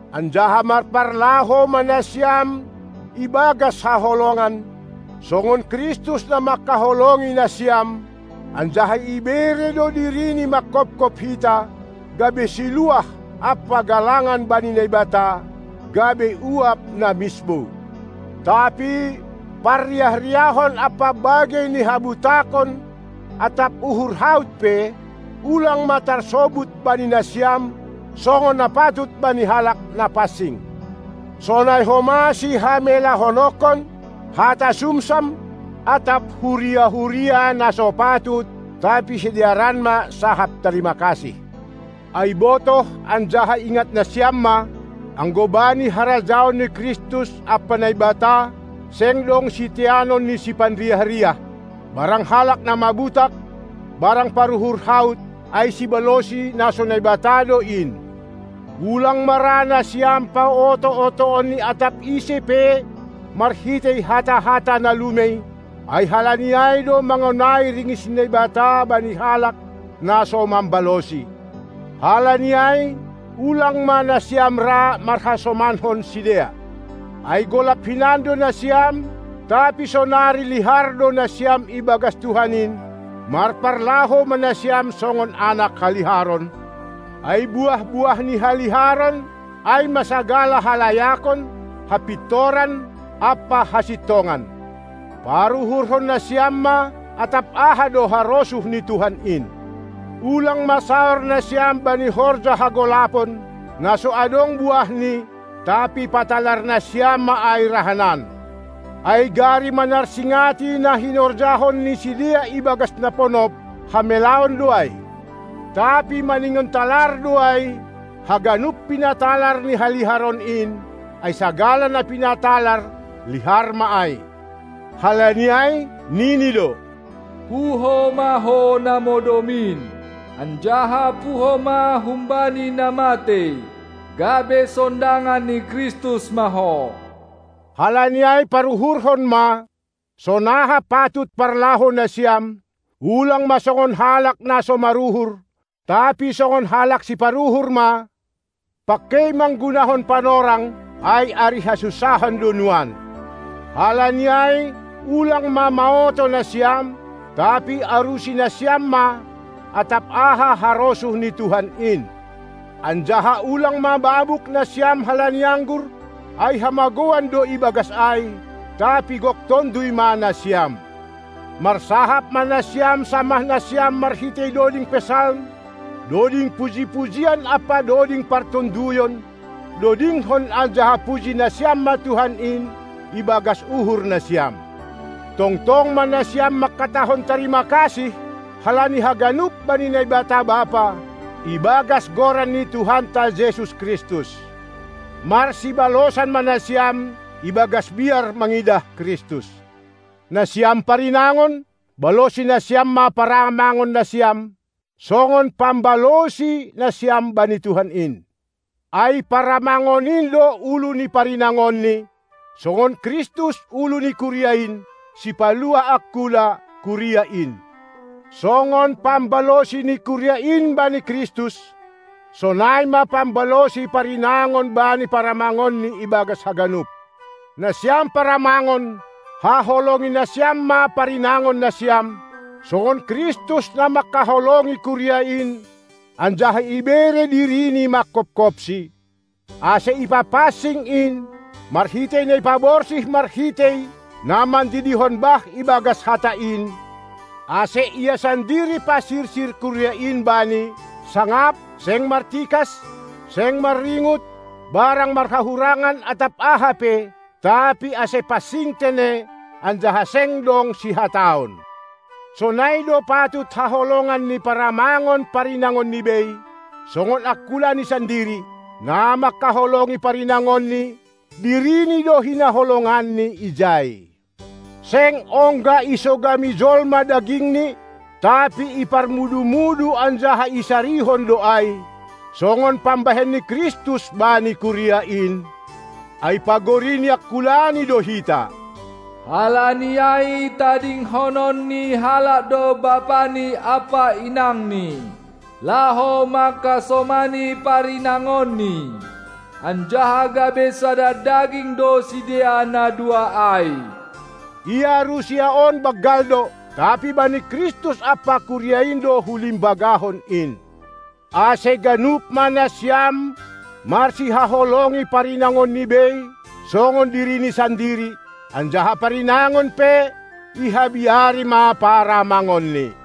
Anjaha marparlahou ma nasiam ibagas haholongan, songon Kristus na manghaholongi nasiam, anjaha ibere do dirini manghophop hita, gabe siluah ampa galangan bani Naibata, gabe uap na misbou. Tapi parriah-riahon ampa bagei ni habutakon atap uhur haut pe, ulang ma tarsobut bani nasiam, songon na patut bani halak na pansing. Sonai homa sihamelahononkon, hata sumsam, atap huria-huria na so patut, tapi sidearan ma sahap tarima kasih. Ai botoh anjaha ingat nasiam ma: Anggo bani harajaon ni Kristus ampa Naibata, seng dong siteanon ni siparriah-riah, barang halak na mabutak, barang paruhur haut, ai sibalosi na so Naibata do in. Ulang ma ra nasiam paoto-otoon ni atap ise pe marhitei hata-hata na lumei, ai halani ai do mangonai ringis ni Naibata bani halak na so mambalosi. Halani ai, ulang ma nasiam ra marhasomanhon sidea! Ai golap hinan do nasiam, tapi sonari lihar do nasiam ibagas Tuhan in; marparlahou ma nasiam songon anak haliharon; ai buah-buah ni haliharon ai ma sagala halayakon, hapintoran ampa hasintongan. Paruhurhon nasiam ma, atap aha do harosuh ni Tuhan in! Ulang ma saor nasiam bani horja hagolapon, na so adong buahni, tapi patalar nasiam ma ai rahanan. Ai gari manarsingati na hinorjahon ni sidea ibagas na ponop, hamelaon do ai. Tapi maningon talar do ai, haganup, pinatalar ni haliharon in, ai sagala na pinatalar, lihar ma ai. Halani ai, nini do: Puho ma ho na modom in, anjaha puho ma humbani na matei, gabe sondangan ni Kristus ma ho. Halani ai paruhurhon ma, sonaha patut parlahou nasiam, ulang ma songon halak na so maruhur, tapi songon halak siparuhur ma, pangkei manggunahon panorang, ai ari hasunsahan do nuan. Halani ai ulang ma maoto nasiam, tapi arusi nasiam ma, atap aha harosuh ni Tuhan in. Anjaha ulang ma mabuk nasiam halani anggur, ai hamagouan do ibagas ai, tapi gok Tonduy ma nasiam! Marsahap ma nasiam samah nasiam marhitei doding Psalm, doding puji-pujian ampa doding partonduyon, dodingkon anjaha puji nasiam ma Tuhan in ibagas uhur nasiam! Tongtong ma nasiam mangkatahon tarima kasih halani haganup bani Naibata Bapa, ibagas goran ni Tuhanta Jesus Kristus! Marsibalosan ma nasiam, ibagas biar mangidah Kristus! Nasiam parinangon, balosi nasiam ma paramangon nasiam, songon pambalosi nasiam bani Tuhan in. Ai paramangon in do ulu ni parinangonni, songon Kristus ulu ni kuria in, sipaluah angkula, (kuria in). Songon pambalosi ni kuria in bani Kristus, sonai ma pambalosi parinangon bani paramangonni ibagas haganup. Nasiam paramangon, haholongi nasiam ma parinangon nasiam, songon Kristus na manghaholongi kuria in anjaha ibere diriNi manghophopsi, ase ipapansing in, marhitei na ipaborsih marhitei na mandidihon bah ibagas Hata in, ase Ia sandiri pasirsir Kuria in Bani, sangap, seng martikas, seng marringut barang marhahurangan atap aha pe, tapi ase pansing tene anjaha seng dong sihataon. Sonai do patut haholongan ni paramangon parinangonni bei, songon angkulani sandiri. Na mangkaholongi parinangonni, dirini do hinaholonganni ijai. Seng ongga isogami jolma daging ni, tapi iparmudu-mudu anjaha isarihon do ai, songon pambahen ni Kristus bani kuria in, ai pagori ni angkulani do hita. Halani ai tadingkonon ni halak do bapani ampa inangni, laho mangkasomani parinangonni, anjaha gabe sada daging do sidea na dua ai. Ia rusia on banggal do; tapi bani Kristus ampa kuria in do hulimbagahon in. Ase ganup ma nasiam marsihaholongi parinangonni bei songon dirini sandiri, anjaha parinangon pe ihabiari ma paramangonni.